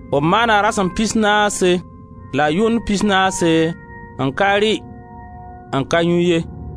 B maana rasem pisnaase la yʋnd pisnaase n ka rɩ, n ka yũ ye.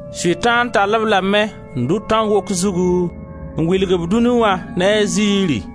Sʋtãan tall-b lame n dʋ tãn wok zugu n wilg-b dũni wã ne a zɩɩri,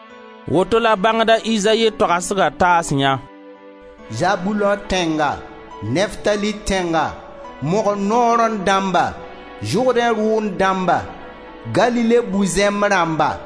Woto la bãngda Izayi toagsga taasyã: Zabulõ tẽnga, Neftali tẽnga, mogr sorẽ dãmba, Zʋrdẽ rʋʋnd dãmba, Galile bu-zẽmb rãmba!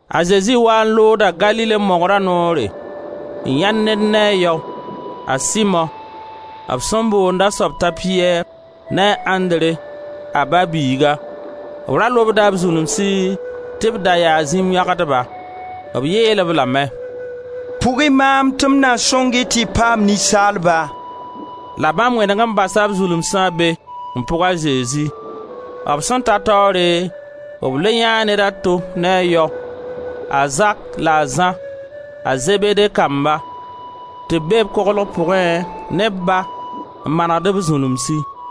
A Zezi waa n looda Galile mogra noore, n yãe ned ne a yao: a Simo, b sẽn boond a soab t'a Piyɛr, ne a Andre, a ba-biiga; b ra lobda b zulumsi tɩ b da yaa zĩm yõgdba. B yeel-b lame: «Pʋg-y maam tɩ m na sõng-y tɩ y paam ninsaalba.» La bãmb wẽneg n basa b zulumsa be n pʋg a Zezi. B sẽn ta taoore, b le yãee ned a to ne a yao, a Zak la a Zã, a Zebede kamba, tɩ b be koglg pʋgẽ ne b ba, n manegd b zulumsi;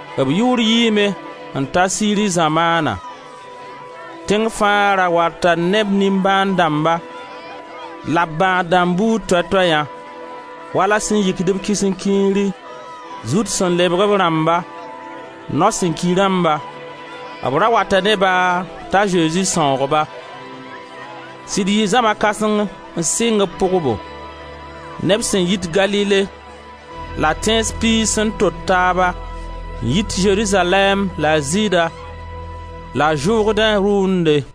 B yʋʋr yiime n ta Siri zamaana; tẽng fãa ra wata ne b nimbãan dãmba la b bãad dãmb buud toɛ toɛyã, wala sẽn yikd-b kisenkiiri, zut sẽn lebg rãmba, nao sẽn ki rãmba. B ra wata ne-ba t'a Zezi sãoog ba. Sɩd yɩɩ zãma kãseng n sɩng b pʋgbo; neb sẽn yit Galile la Tẽns piig sẽn tot taaba, n yit Zerizalɛɛm la Zɩɩda la Zʋrdẽ rʋʋnde.